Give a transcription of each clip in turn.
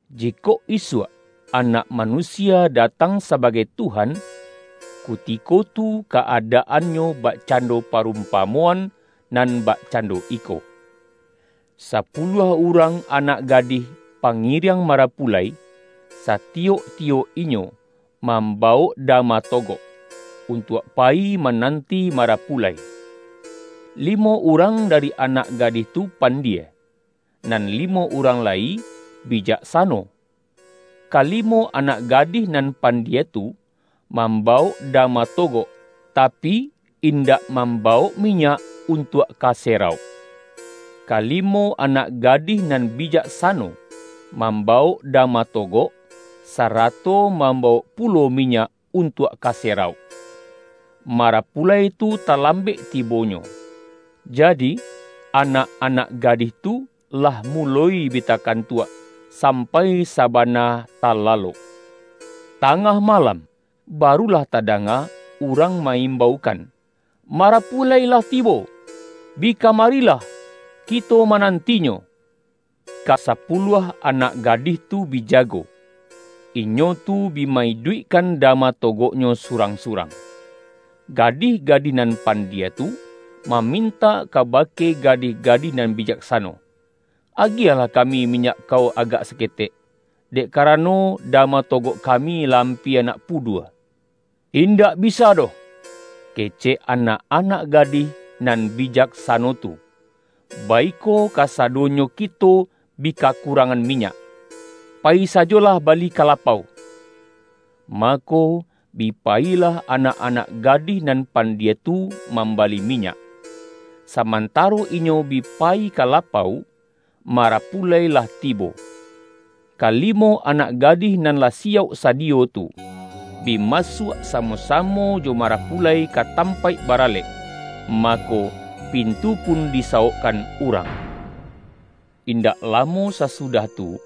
”Jikok isuak Anak Manusia datang sabagai Tuhan, kuti-ko tu ka-adaannyo bakcando parum-pamoan nan bakcando iko: Sapuluah urang anak gadih pangiriang marapu-lai, satiyok-tiyok inyo mambawok da-ma togok, untuak payi mananti ma-rapulai. Limo urang dari anak gadih tu pandie, nan limo urang lai bijaksa-no. Kalimo anak gadih nan pandie tu, mambawok dama togok, tapi, in-dak mambawok minyak untuak ka se-rauk. Kalimo anak gadih nan bijak-sano, mambawok dama togok, sarato mambawok pulo minyak untuak ka serauk. Marapulai tu talambek ti-bonyo, jadi, anak-anak gadih tu lah muloi bi takantuak, sampai sabana talalok. Tangah malam, barulah tadanga urang ma-imbaukan, ’Marapulai lah tibo! Bi kamarilah, kito manantinyo!’ Kasapuluah anak gadih tu bi jago, inyo tu bi ma-iduikkan dama togok-nyo surang-surang. Gadih-gadih nan pandie tu, mamintak kabake gadih-ga-dih nan bijaksano, ’Agiahlah kami mi-nyak kau agak saketek, dek karano da-ma togok kami lah ampia nak pudua.’ ’Indak bisa doh!’ kecek anak-anak ga-dih nan bijaksano tu, ’baiko kasadonyo kito bi kakurangan minyak. Payi sajolah bali ka lapau.’ Mako, bi pa-yilah anak-anak gadih nan pandie tu mambali minyak. Samantaro inyo bi payi ka lapau, marapulai lah tibo. Ka-limo anak gadih nan lah siyauk sadiyo tu, bi masuak samo-samo jo marapu-lai ka tampaik baralek, mako, pintu pun disawokkan urang! Indak lamo sasudah tu,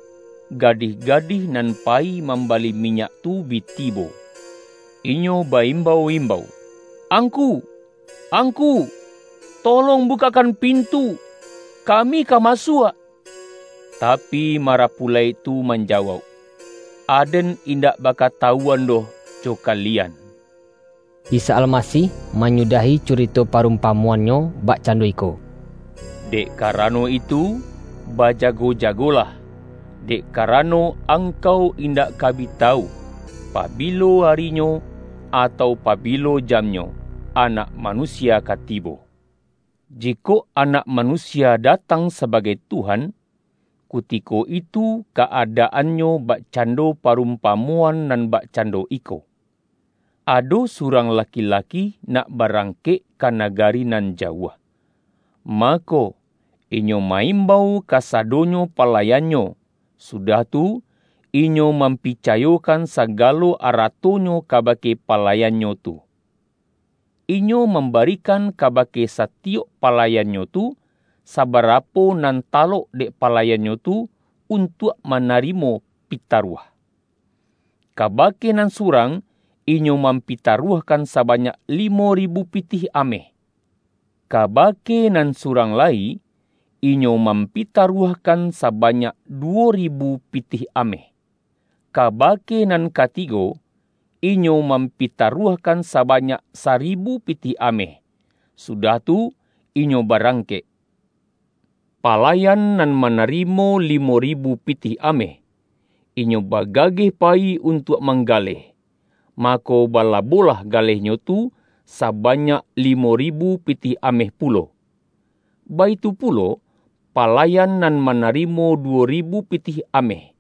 gadih-ga-dih nan payi mambali minyak tu bi tibo. Inyo ba-imbau-imbau, ’Angku, Angku, tolong bukakkan pintu, ka-mi ka masuak.’ Tapi, marapulai tu manjawauk, ’Aden indak bakatawuan doh jo kalian!’” Isa Almasih manyudahi curito pa-rumpamoan-Nyo bakcando iko,”Dek karano itu bajago-jagolah, dek karano angkau indak ka bi tawu, pabilo ari-nyo, atau pabilo jamnyo, Anak Manu-sia ka tibo.” ”Jikok Anak Manusia datang sa-bagai Tuhan, kutiko itu ka-adaannyo bakcando parumpamoan nan bakcan-do iko. Ado surang laki-laki nak ba-rangkek ka nagari nan jauah. Mako, inyo ma-imbau kasadonyo palayan-nyo, sudah tu, inyo mampicayokan sagalo aratonyo kabake palayannyo tu. Inyo mambarikan kabake sati-yok palayannyo tu, sabarapo nan ta-lok dek palayannyo tu untuak manari-mo pitaruah. Kabake nan surang inyo mampitaruahkan sabanyak limo ri-bu pitih ameh. Kabake nan surang lai inyo mampitaruahkan sabanyak du-wo ribu pitih ameh. Kabake nan ka-tigo inyo mampitaruahkan sabanyak saribu pitih ameh. Sudah tu inyo ba-rangkek. Palayan nan manarimo limo ribu pitih ameh, inyo bagageh payi untuak manggaleh, mako bala-bolah galehnyo tu sabanyak limo ribu pitih ameh pulo. Baitu pulo palayan nan manarimo duwo ribu pitih ameh,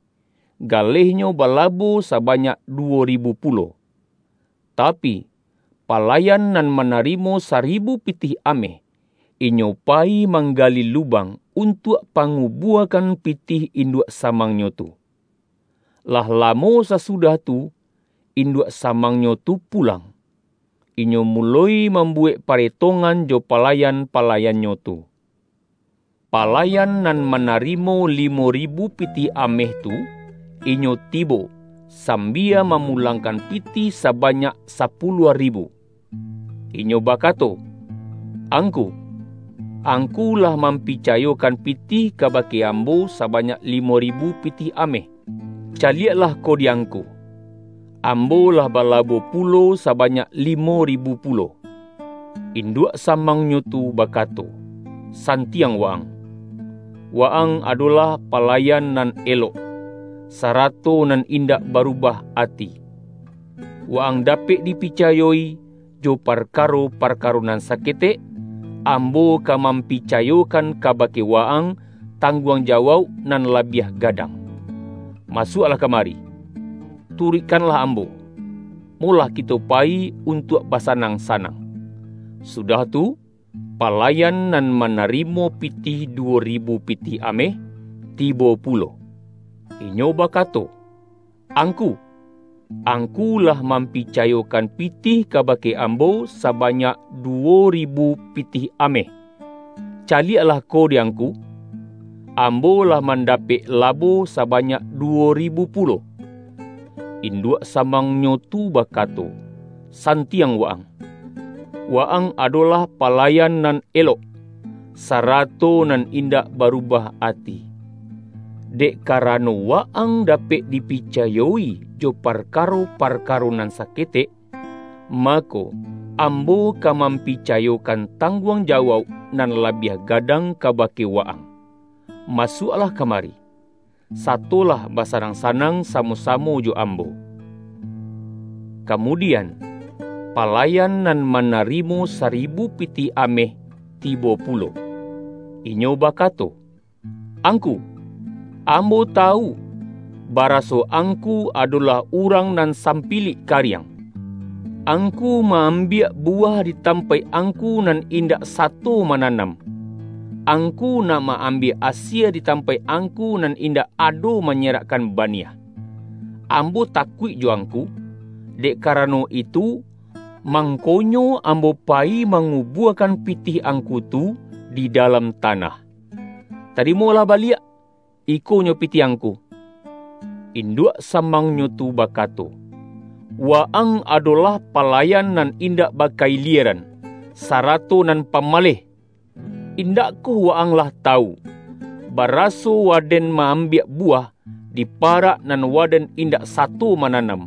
galehnyo balabo sabanyak duwo ribu pulo. Tapi, palayan nan manarimo saribu pitih ameh, inyo payi mangga-li lubang, untuak pangubuakan pitih induak samangnyo tu. Lah lamo sasudah tu, induak sa-mangnyo tu pulang, inyo muloi mam-buwek paretongan jo palayan-palayan-nyo tu. Palayan nan manarimo limo ribu pitih ameh tu, inyo tibo, sambia mamulangkan pitih sabanyak sapu-luah ribu. Inyo bakato, ’Angku!Angku lah mampicayokan pitih kabake am-bo sabanyak limo ribu pitih ameh. Ca-lieklah ko di angku, ambo lah balabo pulo sabanyak limo ribu pulo.’ In-duak samangnyo tu bakato.’Santiang wa-ang! Wa-ang adolah palayan nan elok, sarato nan indak barubah ati. Wa-ang dapek dipicayo-i jo parkaro-parkaro nan saketek, ambo ka mam-picayokan kabake wa-ang tangguang jawauk nan labiah gadang. Masuaklah kamari, turuikkanlah ambo, molah ki-to payi untuak basanang-sanang!’ Sudah tu, palayan nan manari-mo pitih duwo ribu pitih ameh, tibo pulo, inyo bakato, ’Angku, angku lah mampicayokan pitih kabake ambo sa-banyak duwo ribu pitih ameh. Caliek-lah ko di angku, ambo lah manda-pek labo sabanyak duwo ribu pulo.’ Induak samangnyo tu bakato, ’San-tiang wa-ang! Wa-ang adolah palayan nan elok, sarato nan indak barubah ati. Dek karano wa-ang dapek dipica-yo-i jo parkaro-parkaro nan saketek, mako, ambo ka mampicayokan tang-guang jawauk nan labiah gadang ka-bake wa-ang. Masuaklah kamari, sa-tolah basanang-sanang samo-samo jo ambo!’ Kamudian, palayan nan manarimo saribu pitih ameh tibo pu-lo, inyo bakato, ’Angku, ambo tawu, baraso angku adolah urang nan sampilik kariang. Angku ma-ambiak bu-wah di tampaik angku nan indak sa-to mananam, angku nak ma-ambiak asie di tampaik angku nan indak ado manyerakkan baniah. Ambo takuik jo angku, dek karano itu, mangkonyo ambo payi mangubuakan pitih ang-ku tu di dalam tanah. Tarimolah ba-liak, ikonyo pitih angku.’ Induak samangnyo tu bakato, ’Wa-ang ado-lah palayan nan indak baka-ilieran, sarato nan pamaleh! Indakkoh wa-ang lah tawu, baraso waden ma-am-biak buwah, di parak nan waden in-dak sato mananam,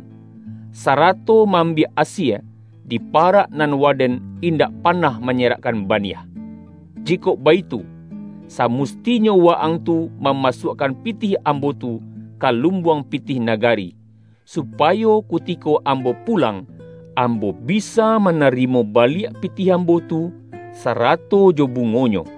sarato ma-ambiak asie, di parak nan waden indak panah manyerakkan baniah? Jikok baitu, samustinyo wa-ang tu mamasuakkan pitih ambo tu, ka lumbuang pitih na-gari, supayo kutiko ambo pulang, am-bo bisa manarimo baliak pitih ambo tu, sarato jo bungonyo.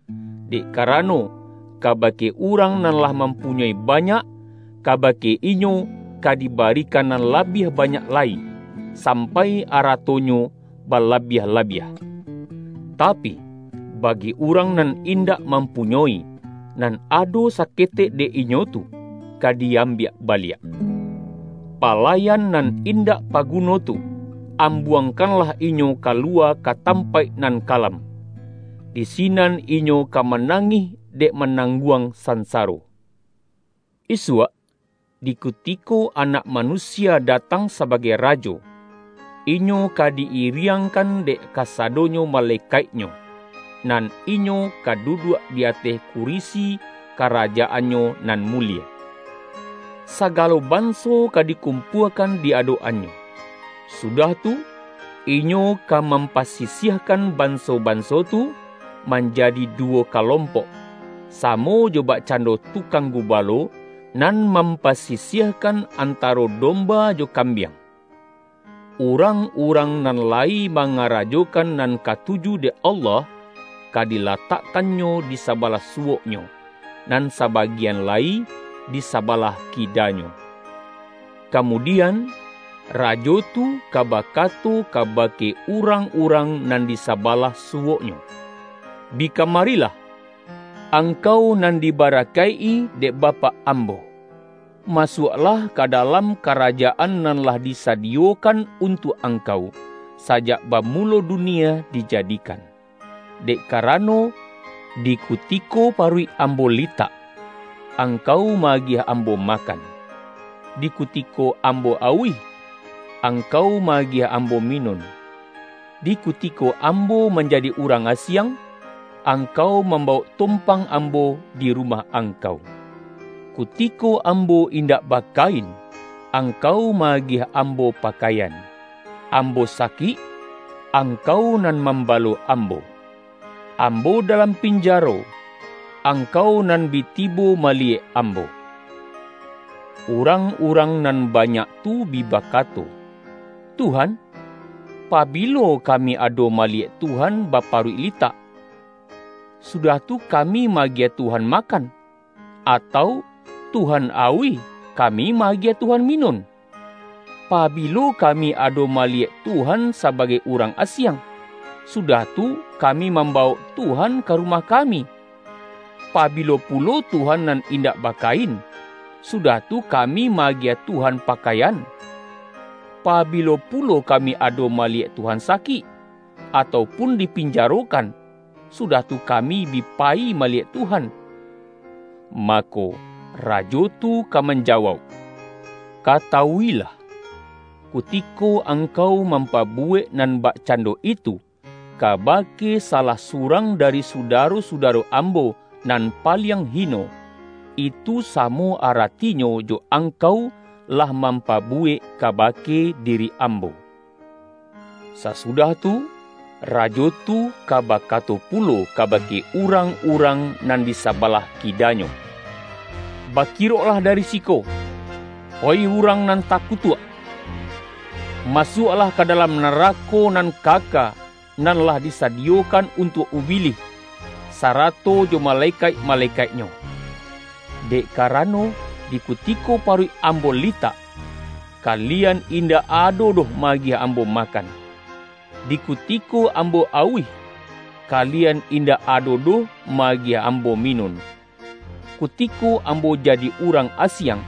Dek karano, kabake urang nan lah mampunyoi banyak, kabake inyo ka dibarikan nan labiah banyak lai, sampai aratonyo balabiah-labiah. Tapi, bagi urang nan indak mampu-nyoi, nan ado saketek dek inyo tu, ka di-ambiak baliak. Palayan nan in-dak paguno tu, ambuangkanlah inyo kaluwa ka tampaik nan kalam. Di si-nan inyo ka manangih dek manang-guang sansaro!’” ”Isuak, di kutiko Anak Manusia datang sabagai Rajo, Inyo ka di-iriang-kan dek kasadonyo malekaik-Nyo, nan Inyo ka duduak di ateh kurisi karajaan-Nyo nan mulie. Sagalo banso ka di-kumpuakan di adok-an-Nyo. Sudah tu, Inyo ka mampasisiahkan banso-banso tu, manjadi duwo kalompok, samo jo bakcando tukang gubalo, nan mampasisiahkan antaro domba jo kam-biang. Urang-urang nan layi ma-ngarajokan nan katuju dek Allah, ka dilatakkan-Nyo di sabalah suwok-Nyo, nan sabagian lai di sabalah kida-Nyo. Kamudian, Rajo tu ka bakato kaba-ke urang-urang nan di sabalah suwok-Nyo, ’Bi kamarilah, angkau nan diba-rakaik-i dek Bapak Ambo. Masuaklah ka dalam Karajaan nan lah disadiyo-kan untuak angkau, sajak bamulo du-nie dijadikan. Dek karano, di kutiko paruik Ambo litak, angkau ma-agiah Ambo makan, di kutiko Ambo auih, angkau ma-agiah Ambo minun. Di ku-tiko Ambo manjadi urang asiang, ang-kau mambawok tompang Ambo di ru-mah angkau. Kutiko Ambo indak bakain, angkau ma-agiah Ambo pa-kaian. Ambo sakik, angkau nan mam-balo Ambo. Ambo dalam pinjaro, ang-kau nan bi tibo maliyek Ambo.’ Urang-urang nan banyak tu bi ba-kato, ’Tuhan, pabilo kami ado maliyek Tuhan baparuik litak, sudah tu kami ma-agiah Tuhan makan, atau Tuhan auih kami ma-agiah Tuhan minun? Pabilo kami ado maliyek Tuhan sa-bagai urang asiang, sudah tu kami mambawok Tuhan ka rumah kami? Pabilo pulo Tuhan nan indak bakain, sudah tu kami ma-agiah Tuhan pa-kaian? Pabilo pulo kami ado mali-yek Tuhan sakik, atau pun dipinjaro-kan, sudah tu kami bi payi maliyek Tuhan?' Mako, Rajo tu ka manja-wauk, ’Katawuilah: kutiko angkau mampabuwek nan bakcando itu, ka-bake salah surang dari sudaro-suda-ro Ambo, nan paliang hino, itu samo aratinyo jo angkau lah mampabuwek kabake diri Ambo!’ Sasudah tu, Rajo tu ka bakato pu-lo kabake urang-urang nan di sabalah kida-Nyo, ’Bakiroklah dari siko, oih urang nan takutuak! Masuaklah ka dalam narako nan kaka, nan lah disa-diyokan untuak ubilih, sarato jo malekaik-malekaiknyo! Dek karano, di kutiko paruik Ambo litak, kalian in-dak ado doh ma-agiah Ambo makan; di kutiko Ambo auih, kalian indak ado doh ma-agiah Ambo minun. Kutiko Ambo jadi urang asiang,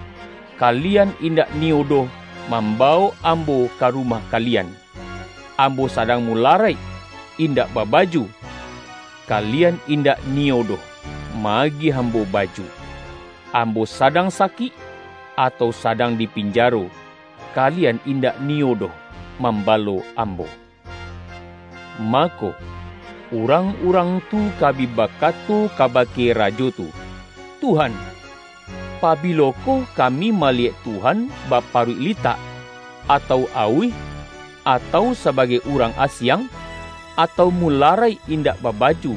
kalian indak niyo doh mambawok Ambo ka rumah kalian. Ambo sadang mularaik, indak babaju, kalian indak niyo doh ma-agiah Ambo baju. Ambo sadang sakik, atau sadang di pinjaro, kalian indak niyo doh mambalo Ambo.’ Mako, urang-urang tu ka bi bakato kabake Rajo tu, ’Tuhan, pabilo koh kami maliyek Tuhan baparuik litak, atau auih, atau sabagai urang asiang, atau mularaik indak babaju,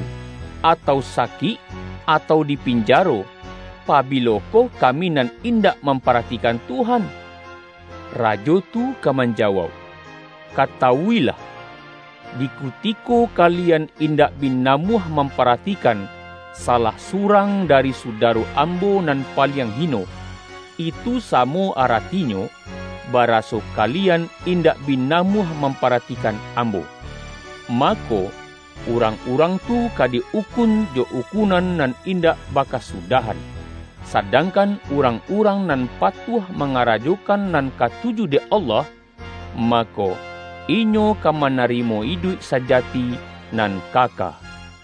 atau sakik, atau di pin-jaro, pabilokoh kami nan indak mam-paratikan Tuhan?' Rajo tu ka man-jawauk, ’Katawuilah: di kutiko kalian indak bi namuah mamparatikan, sa-lah surang dari sudaro Ambo nan pa-liang hino, itu samo aratinyo, baraso kalian indak bi namuah mamparati-kan Ambo.’ Mako urang-urang tu ka di ukun, jo ukunan nan indak ba-kasudahan, sadangkan urang-urang nan patuah mangarajokan nan katu-ju dek Allah, mako, inyo ka manari-mo idu ik sajati nan kaka.”